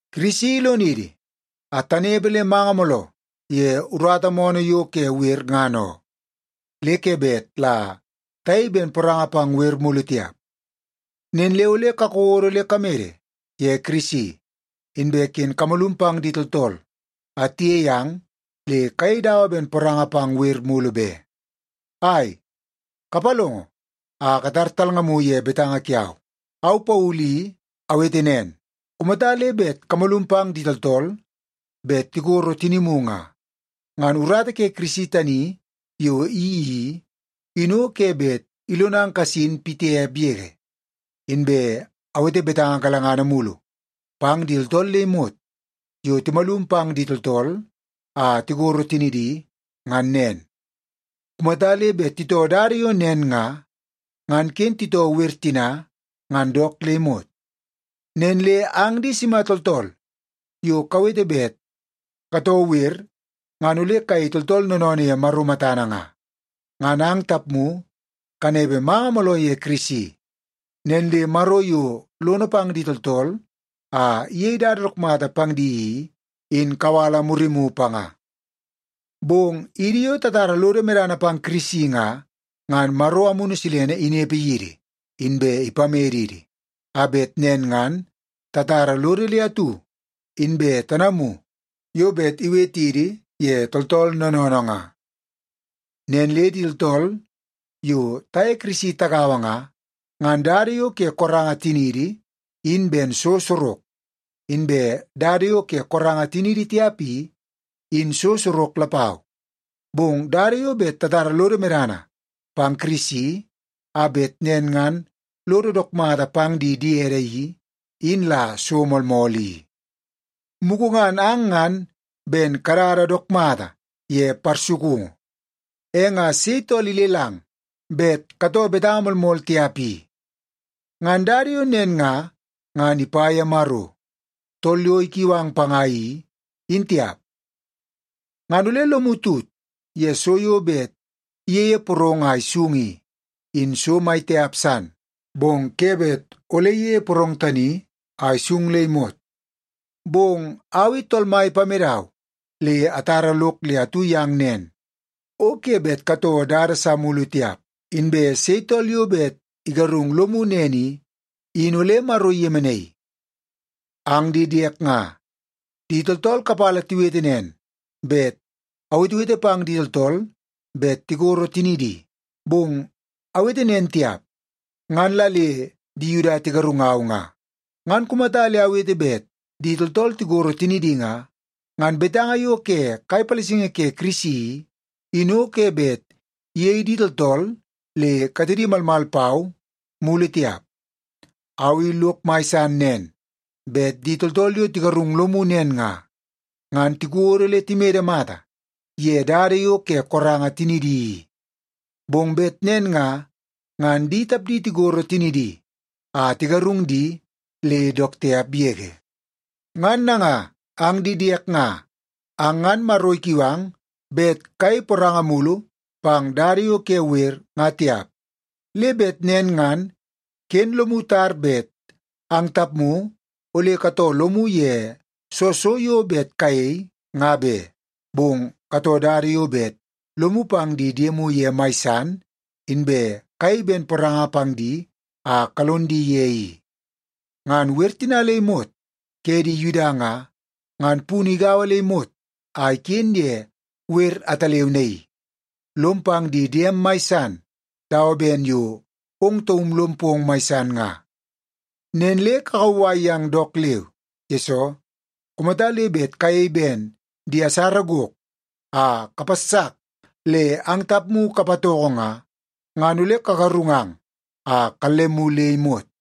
Kirisi ilonidi a tanepe le manga mooloo ye urata moonoo yo ke wer ngan oo. Le ke bet la tayei ben poranga pang wer mulu tiap. Nen le ole kakodo le kamede ye Kirisi, inbe ken kamalum pang di tooltool a tiyei ang le kayei dawa ben poranga pang wer mulu be. Ai, kapalongo a katar talngamu ye betanga kiau. Au Paulu i awete nen, kumata le bet kamalum pang di tooltool bet tikoro tinimu nga, ngan urata ke Kirisi tani yo iyeii i, in o ke bet ilonang kasin pitiap yege. Inbe awete betanga galangana mulu pang di tooltool le imot yo timalum pang di tooltool a tikoro tinidi ngan nen. Kumata le bet titoo dada yo nen nga, ngan ken titoo wer tina ngan dook le imot. Nen le ang di sima tooltool yo kawete bet katoo wer ngan ole kayei tooltool noonoonoo ye Maro matana nga, ngan ang tapmu kanepe manga mooloo ye Kirisi. Nen le Maro yo lono pang di tooltool a iyei dada dook mata pang di i, in kawala murimu panga. Bong idi yo tatara lodo medana pang Kirisi nga, ngan Maro Amunu Silene inepe yidi inbe ipamedidi a bet nen ngan tatara lodo le atu, inbe tanamu yo bet iwetidi ye tooltool noonoonoo nga. Nen le idi tooltool yo taye Yesu Kirisi tagaua nga, ngan dada yo ke koranga tiniidi in ben so sorok, inbe dada yo ke koranga tiniidi tiap i, in so sorok lapau. Bong dada yo bet tatara lodo medana pang Kirisi a bet nen ngan lodo dook mata pang di diede i, in la so moolmool i. Mugu ngan ang ngan ben kadada dook mata ye parsukungu. E nga sei tool ilelang bet katoo betanga moolmool tiap i? Ngan dada yo nen nga, ngan ipa ye Maro, tool yo ikiu ang panga i, in tiap. Ngan ole lomu tut ye so yo bet iyeie porong a isung i, in so mai tiap san, bong ke bet ole iyeie porong tani a isung le imot. Bong au i Tool Mai ipamedau le atara lok le atu yang nen, o ke bet katoo dada sa mulu tiap. Inbe sei tool yo bet igarung lomu nen i, in ole Maro iyemenaii. Ang di diek nga, di tooltool kapala tiwete nen bet awetewete pang di tooltool bet tikoro tinidi. Bong awete nen tiap, ngan la le di Yuda tigarungau nga. Ngan kumata le awete bet di tooltool tikoro tinidi nga, ngan betanga yo ke kai palasingi ke Kirisi i, in o ke bet iyei di tooltool le katedi malmal pau mulu tiap. Au i lok mai san nen bet di tooltool yo tigarung lomu nen nga, ngan tikodo le timede mata ye dada yo ke koranga tinidi i. Bong bet nen nga, ngan di tapdi tikoro tinidi a tigarung di le dook tiap yege. Ngan nanga ang di diek nga, ang ngan Maro ikiu ang bet kayei poranga mulu pang dada yo ke wer, nga tiap. Le bet nen ngan ken lomu tar bet ang tapmu ole katoo lomu ye soo so yo bet kayei nga be. Bong katoo dada yo bet lomu pang di diemu ye mai san inbe kayei ben poranga pang di a kalon di ye i. Ngan wer tina le imot ke di Yuda nga, ngan punu igaua le imot a iken ye wer ataleu naii: “Lom pang di diem mai san dawa ben yo ong taum lom pong mai san nga.” Nen le kakauwai yang dook leu. Yesoo, kumata le bet kayei ben di asara gok a kapassak le ang tapmu kapatoko nga, ngan ole kagarungang a kallemu le imot.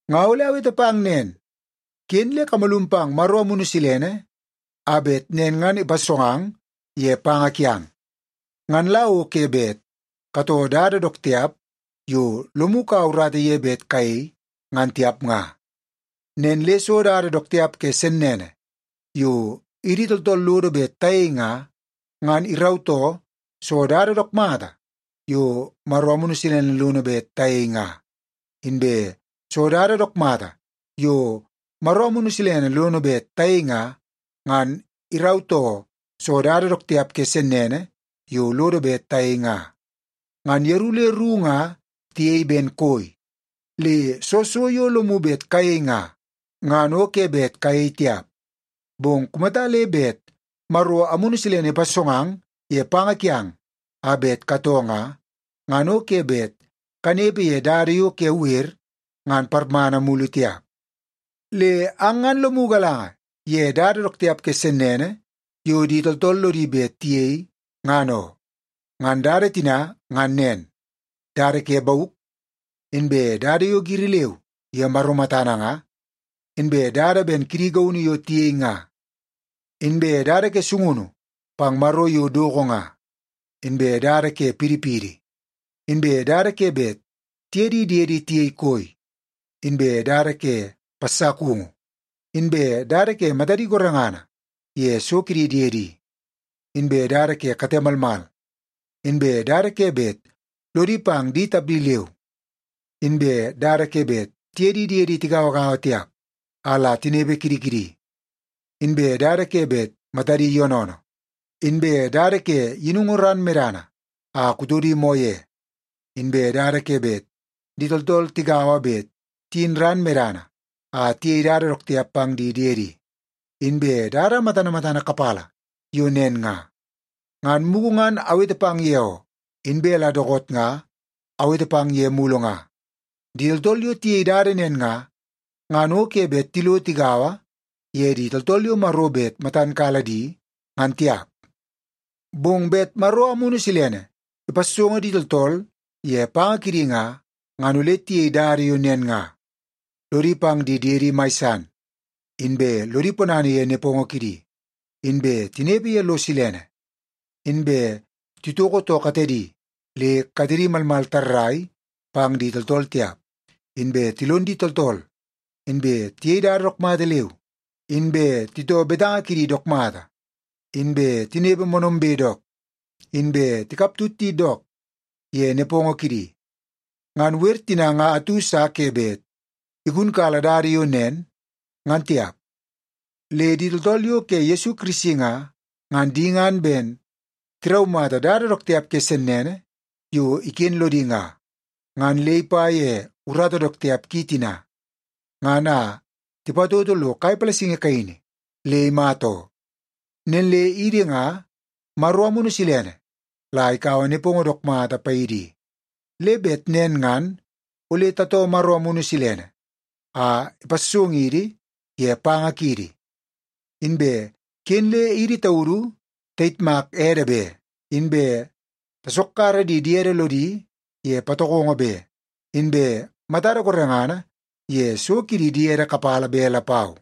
Nga ole awete pang nen, ken le kamalum pang Maro Amunu Silene a bet nen ngan ipassongang ye panga kiang. Ngan la o ke bet katoo dada dook tiap yo lomu kaua urata ye bet kayei, ngan tiap nga. Nen le soo dada dook tiap ke sennene yo idi tooltool lodo bet tayei nga, ngan irautoo soo dada dook mata yo Maro Amunu Silene lono bet tayei nga. Inbe soo dada dook mata yo Maro Amunu Silene lono bet tayei nga, ngan irautoo soo dada dook tiap ke sennene yo lodo bet tayei nga. Ngan yeru le ru nga tiyei ben koi, le soo so yo lomu bet kayei nga, ngan o ke bet kayei tiap. Bong kumata le bet Maro Amunu Silene ipassongang ye panga kiang a bet katoo nga, ngan o ke bet kanepe ye dada yo ke wer ngan parmana mulu tiap. Le ang ngan lomu galanga ye dada dook tiap ke sennene yo di tooltool lodi bet tiyei ngan oo. Ngan dada tina ngan nen: dada ke bauk, inbe dada yo giri leu ye Maro matana nga, inbe dada ben kidi gaunu yo tiyei nga, inbe dada ke sungunu pang maro yo doko nga, inbe dada ke pidipidi, inbe dada ke bet tiye di diedi tiyei koi, inbe dada ke passakungu, inbe dada ke matadi gorengana ye so kidi diedi, inbe dada ke kate malmal, inbe dada ke bet lodi pang di tapdi leu, inbe dada ke bet tiye di diedi tigauagaua tiap a la tinepe kidi kidi, inbe dada ke bet matadi yoonoonoo, inbe dada ke yinungu ran medana a kutodi moo ye, inbe dada ke bet di tooltool tigaua bet tiyin ran medana a tiyei dada dook tiap pang di diedi, inbe dada matana matana kapala yo nen nga. Ngan mugu ngan awete pang ye oo, inbe la dookoot nga awete pang ye mulu nga. Di tooltool yo tiyei dada nen nga, ngan o ke bet tilo tigaua ye di tooltool yo Maro bet matan kala di ngan tiap. Bong bet Maro Amunu Silene ipassongo di tooltool ye panga kidi nga, ngan ole tiyei dada yo nen nga: lodi pang di diede mai san, inbe lodi ponana ye nepongo kidi, inbe tinepe ye lo silene, inbe titoko too katedi le katedi malmal tarrai pang di tooltool tiap, inbe tilon di tooltool, inbe tiyei dada dook mata leu, inbe titoo betanga kidi dook mata, inbe tinepe moonoombe dook, inbe tikaptut di dook ye nepongo kidi. Ngan wer tina nga atu sa ke bet igunkala dada yo nen ngan tiap. Le di tooltool yo ke Yesu Kirisi nga, ngan di ngan ben tiraumata dada dook tiap ke sennene yo iken lodi nga, ngan le ipa ye urata dook tiap ki tina, ngan a tipatoto lo kai palasingi kaini le imata oo. Nen le idi nga Maro Amunu Silene la ikaua nepongo dook mata paidi i. Le bet nen ngan ole tatoo Maro Amunu Silene a ipassongidi ye panga kiidi. Inbe ken le idi taudu tayitmak ede be, inbe tasokkara di diede lodi ye patokongo be, inbe matada gorengana ye so kidi diede kapala be lapau.